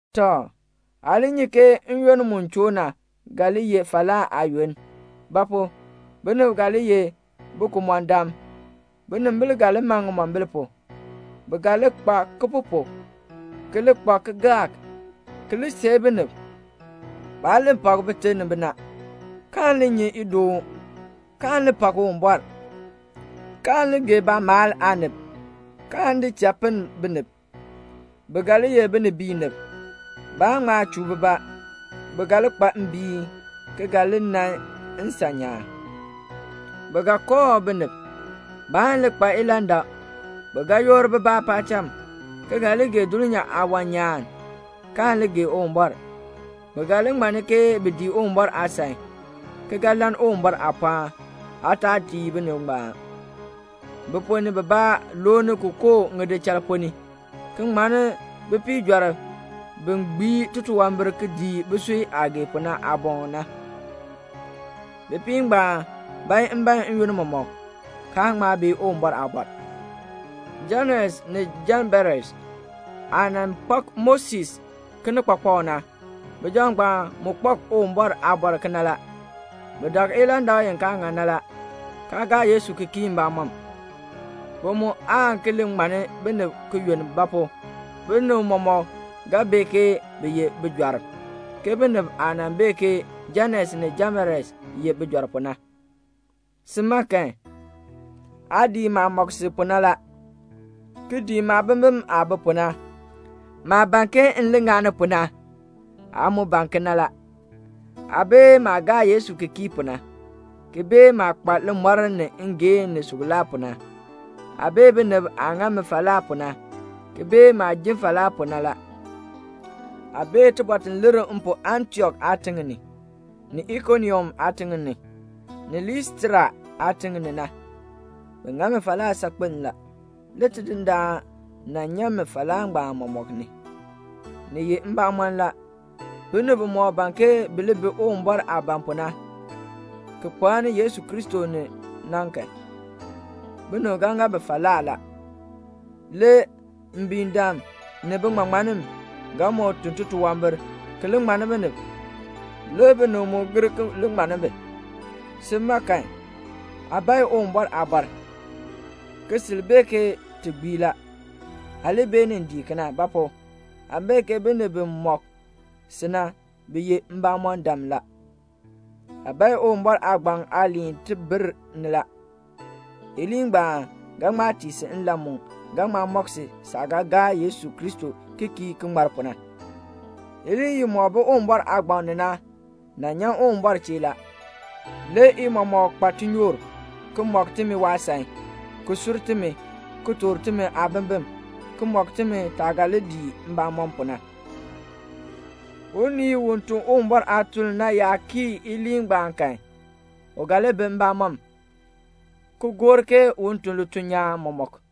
Tɔ, aa li nyi ke n-yoonn mu choo na ga li ye falaa aayoonn. Ba pu? binib ga li ye bikumɔndam. Binimbil ga li man ŋimombil pu. Bi ga nyu baalaa, ki li kpa kalmbaani, ki li seei binib. Baan li pak bite ni bina, kaan li nyi idoon, kaan li pak Uwumbɔr, kaan li gee baamaal aanib, kaan di cha pinn binib. Bi ga li ye binibiinib. Baan ŋma chuu bibaa. Bi ga li kpa mbiin, ki ga li nan nsan nyaan. Bi ga kooh binib. Baan li kpa ilandak. Bi ga yoor bibaa paacham, ki ga li gee dulnyaa aawan nyaan, kaan li gee Uwumbɔr. Bi ga li ŋmanni ke bi dii Uwumbɔr aasan, ki ga lann Uwumbɔr aapɔɔn. Aa taa dii binib ngbaan. Bi ponn ni bibaa looni ki koo ŋidichal ponn ni, ki ŋmanni bipiijɔrb bi gbii titunwambir ki dii bisui aah gee pu na aaboŋ na. Bipiib ngbaan bae mbaen n-yoonn mɔmɔk, kaa ŋma bee Uwumbɔr aabɔr. Janes ni Jamberes aah nan kpak Moses kinikpakpak na, bijab ngbaan mu kpak Uwumbɔr aabɔr kena la. Bi dak ilandak i kaa ŋan na la, kaa gaa Yesu ki kii mbamɔm. Bi mu aan ki li ŋmanni binib ki yunn; ba pu? binib mɔmɔk ga bee ke bi ye bijɔrb, ke binib aah nan bee ke Janes ni Jamberes ye bijɔrb pu na. Si ma kan, aa dii maah mɔk si pu na la, ki dii maabimbin aah bi pu na. Maah ban ke m li ŋani pu na, aa mu ban kena la. Aa bee maah gaa Yesu ki kii pu na, ki bee maah kpa limɔr ni ngeehn ni suklaa pu na. Aa bee binib aah ŋa mi falaa pu na, ki bee maah ji falaa pu na la. Aa bee tibɔr ti lir m pu Antiok aatiŋ ni, ni Ikonium aatiŋ ni, ni Listra aatiŋ ni na. Bi ŋa mi falaa saakpen la. Le Tidindaan nan nyan mi falaa ngbaan mɔmɔk ni. Ni ye mbamɔn la, binib bimɔk ban ke bi li bi Uwumbɔr aah ban pu na, ki kpaani Yesu Kristo ni na kan, binib ga ŋa bi falaa la. Le mbiindam ni biŋmaŋmannim ga moo tun titunwambir ki li ŋmanni binib, le binib mu gir ki li ŋmanni bi. Sin, aa bae Uwumbɔr aabɔr, ki sil bee ke ti gbii la. Aa li beenin dii kena; ba pu? aa bee ke binib bi mɔk si na, bi ye mbamɔndam la. Aa bae Uwumbɔr aagbaŋ aaliin tibir ni la. Iliin ngbaan ga ŋma tii si nlan mu ga mɔk si saah ga gaa Yesu Kristo ki kii ki ŋmar pu na. Iliin imɔk bi Uwumbɔr aagbaŋ ni na nyan Uwumbɔr chee la. Le i mɔmɔk kpa tinyoor la, ki mɔk timi waasan, ki sur timi, ki toor timi aabimbin, ki mɔk timi taah ga li dii mbamɔm pu na. Unii u tun Uwumbɔr aatuln na yaa kii iliin ngbaan kan, u ga li bi mbamɔm, ki gor ke un tun lituln nyaan mɔmɔk.